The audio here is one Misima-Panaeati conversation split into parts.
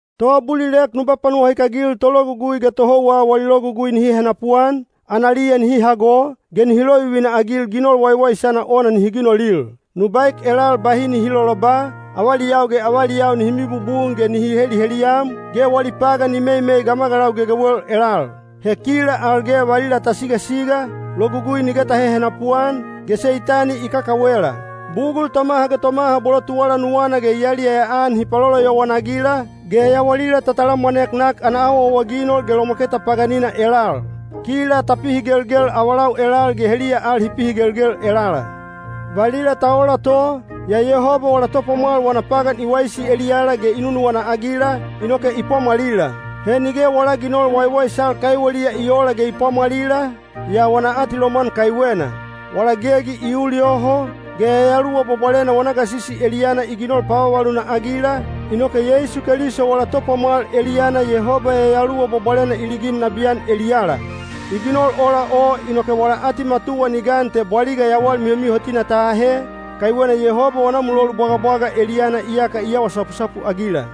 Toabulilek nu panuwahikagil tologugui ge tohouwa wali logugui nihi henapuan, analiya nihi hago, ge nihi lovivina-agil ginol waiwaisana ona nihi ginolil. Nu baek elal bahi nihi loloba, avaliyau ge avaliyau nihi mibubun ge nihi heliheliyam, ge wali pagan ni meimei gamagalau gegewel elal. He kila al ge valila ta sigasiga, logugui nige ta hehenapu-an, ge Seitani i kakawela. Bugul tomaha ge tomaha bolo tuwala nuwana ge i yaliyaya-an hi paloloyowan-agila, ge yawalila ta talamwanek nak ana awaawaginol ge lomwaketa paganina elal. Kila ta pihigelgel avalau elal ge heliya al hi pihigelgel elala. Valila ta ola to, yaa Yehoba wala Topwamwal wana pagan i waisi eliyala ge i nunuwana-agila, inoke i pwamwalila. He nige wala ginol waiwaisal kaiweliya i oola ge i pwamwalila, yaa wana atilomwan kaiwena. Wala gegi i ul yoho, ge Yayaluwa Bwabwalena wana gasisi eliyana i ginol pavavaluna-agila, inoke Yeisu Keliso wala Topwamwal eliyana Yehoba Yayaluwa Bwabwalena i ligin nabiyan eliyala. I ginol ola o inoke wala atimatuwa ni gan te bwaliga yawal mihomihotina ta ahe, kaiwena Yehoba wana mulolu bwagabwaga eliyana iyaka i awa sapusapu-agila.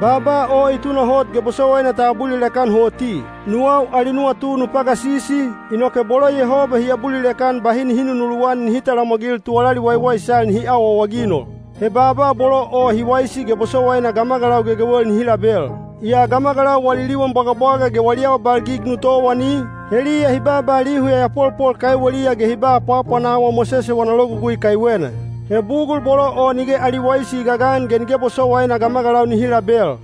Baaba o i tunahot ge bosowaina ta abulilek-an hoti. Nuwau ali nuwatu nu pagasisi, inoke bolo Yehoba hi abulilek-an bahi nihi nunuluwan nihi talamwagil tuwalali waiwaisal nihi awaawaginol. He baaba bolo o hi waisi ge bosowaina gamagalau gegewel nihi label. Yaa gamagalau wali liwan bwagabwaga ge wali awabalgig nu towani, heliya hi baaba lihu yayapolpol kaiweliya ge hi ba apwaapwanawa Mosese wana logugui kaiwena. He bugul bolo o nige ali waisi i gagan ge nige bosowaina gamagalau nihi label.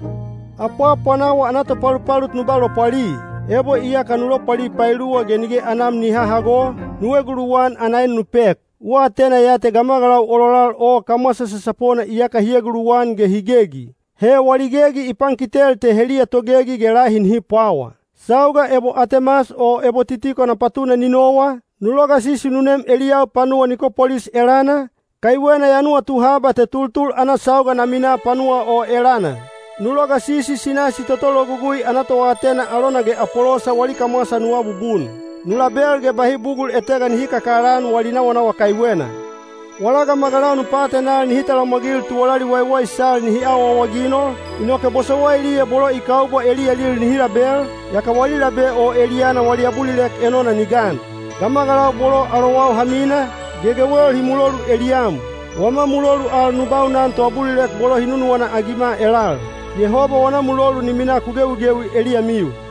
Apwaapwanawa ana topalupalut nu ba lopwali. Ebo iyaka nu lopwali paeluwa ge nige anam ni hahago, nu eguluwan ana en nu pek. U atena ya te gamagalau ololal o kamwasa sasapona iyaka hi eguluwan ge hi gegi. He wali gegi i pankitel te heliya togegi ge lahi nihi pwawa. Sauga ebo Atemas o ebo Titiko na patuna ni nowa, nu logasisi nu nem eliyau panuwa Nikopolis elana, kaiwena ya nuwatu haba te tultul ana sauga na minaa panuwa o elana. Nu logasisi Sinasi toto logugui ana toatena alona ge Apolosa wali kamwasa nu abubun. Nu label ge bahi bugul etega nihi kakalaan wali nawanawa kaiwena. Wala gamagalau nu paatenal nihi talamwagil tuwalali waiwaisal nihi awaawaginol, inoke bosowailiya bolo i kaubwa eliyalil nihi label, yaka wali labe o eliyana wali abulilek enona ni gan. Gamagalau bolo alowau ha mina, gegewel hi mulolu eliyam. Wama mulolu al nu baunan toabulilek bolo hi nunuwana-agima elal. Yehoba wana mulolu ni minaa ku gewigewi eliyamiu.